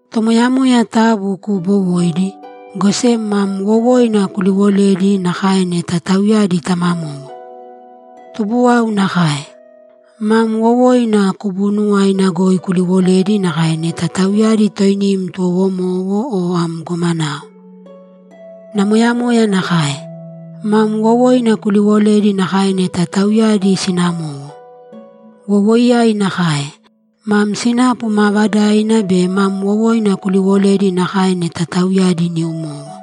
Tomoyamoya taabu kuubowōidi, go sem mam wowoina kubuunuwaina goi kuliwolēdi nakae neta tauyadi tamamowo. Tubuwau nakae; mam wowoina kuliwolēdi nakae neta tauyadi toinim tuwowomowo o am gomanao. Namoyamoya nakae; mam wowoina kuliwolēdi nakae neta tauyadi sinamowo. Wowoiyai nakae; mam sinapu maavadaina be mam wowoina kuliwolēdi nakae neta tauyadi niumowo.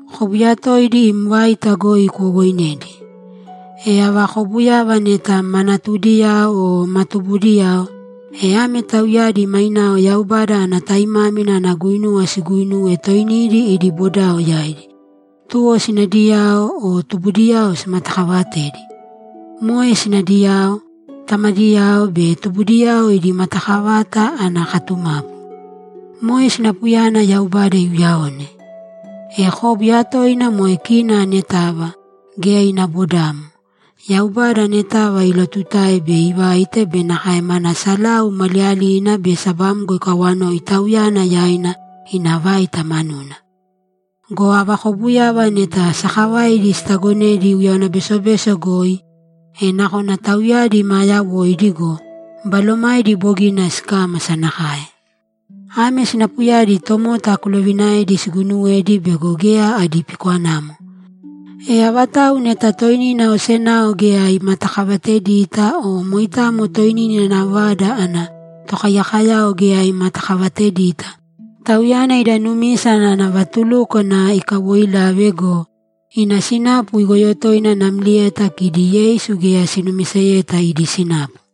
Kóbuya toidi im vaita goi kuwowoinēdi. E ava kobuyava neta ma natudiyao o ma tubudiyao, e ame tauyadi mainao Yaubada ana taimámina ana guinuwa siguuinūwe toinidi idi bodao yaidi, tuwo sinadiyao o tubudiyao simatakaavatēdi. Moe sinadiyao, tamadiyao be tubudiyao idi matakavata ana katumapu. Moe sinapuyana Yaubada iuyaone. E kóbuya toina moe kina anetava, geya ina bodamo, Yaubada anetava ilotutae bei ivaite be nakae mana salau maliyalina be sabamgo ikawanoi Tauyana yaina ina vaita manuna. Go ava kobuyava neta sakavaidi sitagonedi uyáwana besobeso goi, e nakona tauyadi maa yawoidi go, balomaidi bogina sikámasa nakae. Ame sinapuyadi tomota kuloviinaēdi siguuinuwedi bego geya adi pikwanamo. E avatau neta toinina osenao geya imatakavatedita o moitamo toinina ina vada ana tokaiyakoyao geya imatakavatedita, tauyana ida numisa ana vatulúkwana ikawoilave go, ina sinapu igoyo toina namlieta kidi Yeisu geya sinumiseyeta idi sinapu.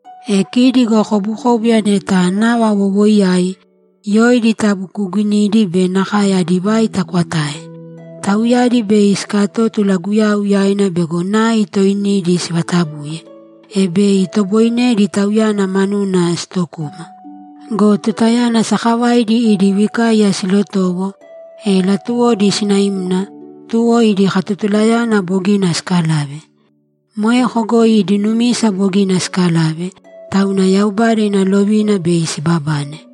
E kidi go kobukóbuya neta nava wowoiyai, yoidi taabu kuuginīdi be nakae adi vaita kwatāe. Tauyadi bei sikatótula Guyau yaina bego nai toinidi sivatabuye, e bei itoboinedi Tauyana manuna sitokuma. Go tutayana sakavaidi idi vikaiya silotowo, e latuwodi sinaimna, tuwo idi katotulayana bogina sikalave. Moeko goi idi numisa bogina sikalave, tauna Yaubada ina lovina bei sibabane.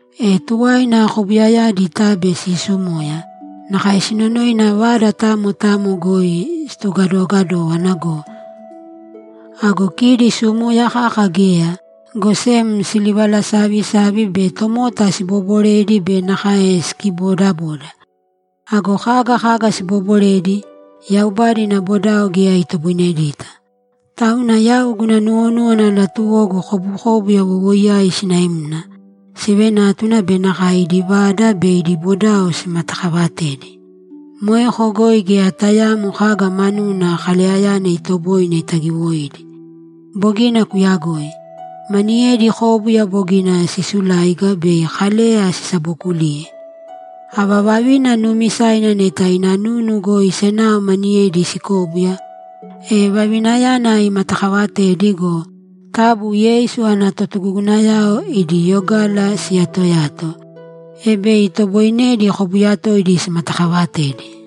E tuwaina kobuyayadi tabe sisumoya; nakae sinonoina vada tamo tamo goi situgadogadówana go! Ago kidi sumoya kaka geya, go sem silivalasavisavi be tomota sibooboredi be nakae sikibodaboda. Ago kaga kaga sibooboredi, Yaubada ina bodao geya itoboinedita. Tauna yau guna nuwonúwana latuwogu kobukóbuya wowoiyai sinaimna, sivenátuna be nakae idi vada be idi bodao simatakavatedi. Moeko goi geya tayaamo kaga manuna Kaleyayana itoboine itagiwoidi. Bogina kuyagoi. Maniyedi kóbuya bogina sisuláiga bei Kaleya sisabookuliye. Ava vavina nuumisaina neta ina nunu goi senao maniyedi sikóbuya, e vavinayana imatakavatēdi go, taabu Yeisu ana totugugunayao idi yogala siyatoyāto, e bei itoboinedi kóbuya toidi simatakavatedi.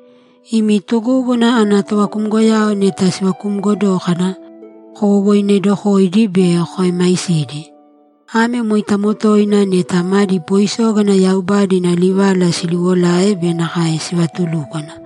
Imi tugúguna ana tovakumgoyao neta sivakumgo dókana, kowowoinedokōidi be koemaisīdi. Ame moitamo toina neta madi poisógana Yaubada ina livala siliwolae be nakae sivatulúkwana.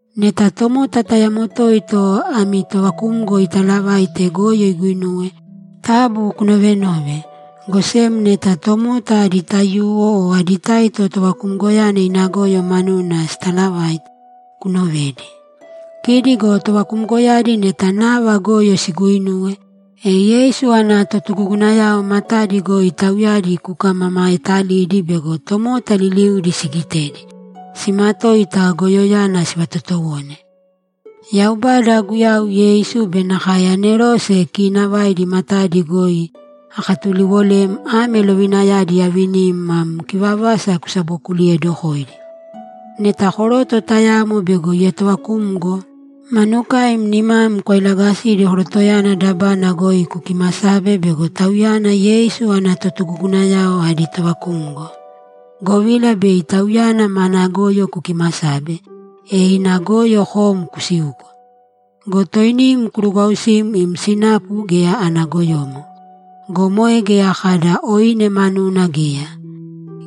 Neta tomota tayamo toito ami tovakumgo italavaite goyo iguinuwe, taabu kunovenōve, go sem neta tomota adi taiyuwo o adi taito tovakumgoyana ina goyo manuna sitalavaita, kunovēdi. Kidi go tovakumgoyadi neta nava goyo siguuinuwe, e Yeisu ana totugugunayao matadi goi tauyadi kukamamaetalīdi bego tomota liliudi sigitedi, simatoita goyoyana sivatotowone. Yaubada, Guyau Yeisu be nakae anerose kiinavaidi matadi goi akatuliwolem ame lovinayadi aavinim mam kivavasa kusabokuliyeedokōidi. Neta koroto tayamo bego ietovakumgo, manukaim nimam kwailagasīdi korotoyana dabana goi kukimasābe bego tauyana Yeisu ana totugugunayao adi tovakumgo, govila bei tauyana mana goyo kukimasabe, e ina goyo kom kusiuko. Go toinim kurugwausīm im sinapu geya ana goyomo. Go moe geya kada oine manuna geya.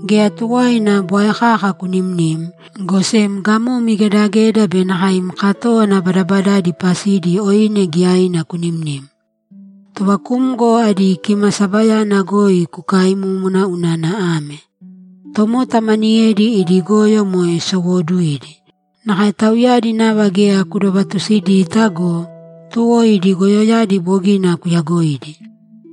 Geya tuwaina bwae kaka kunimnīm, go sem gamom igedageda be nakae im katówana badabadaidi pasidi oine giyaina kunimnīm. Tovakumgo adi kimasabayana goi kukaimūmuna unana ame: Tomota maniyedi idi goyo moe sowooduidi. Nakae tauyadi nava geya kudovatusidita go, tuwo idi goyoyadi bogina kuyagoidi.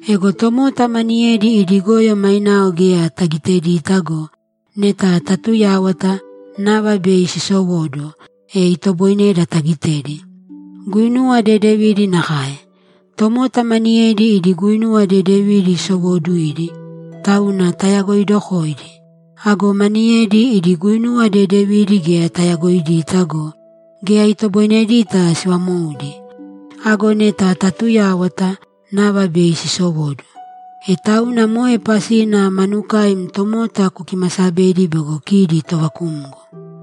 Ego tomota maniyedi idi goyo mainao geya tagitedita go, neta tatuyáwata, nava bei sisowóduwo, e itoboineda tagitedi. Guinuwa dedevidi nakae. Tomota maniyedi idi guinuwa dedevidi sowooduidi, tauna tayagoidokoidi. Ago maniyedi, idi guinuwa dedevidi geya tayagoidita go, geya itoboinedita sivamoudi. Ago neta tatuyáwata, nava bei sisowóduwo. E tauna moe pasina manukaim tomota kukimasabedi bego kidi tovakumgo.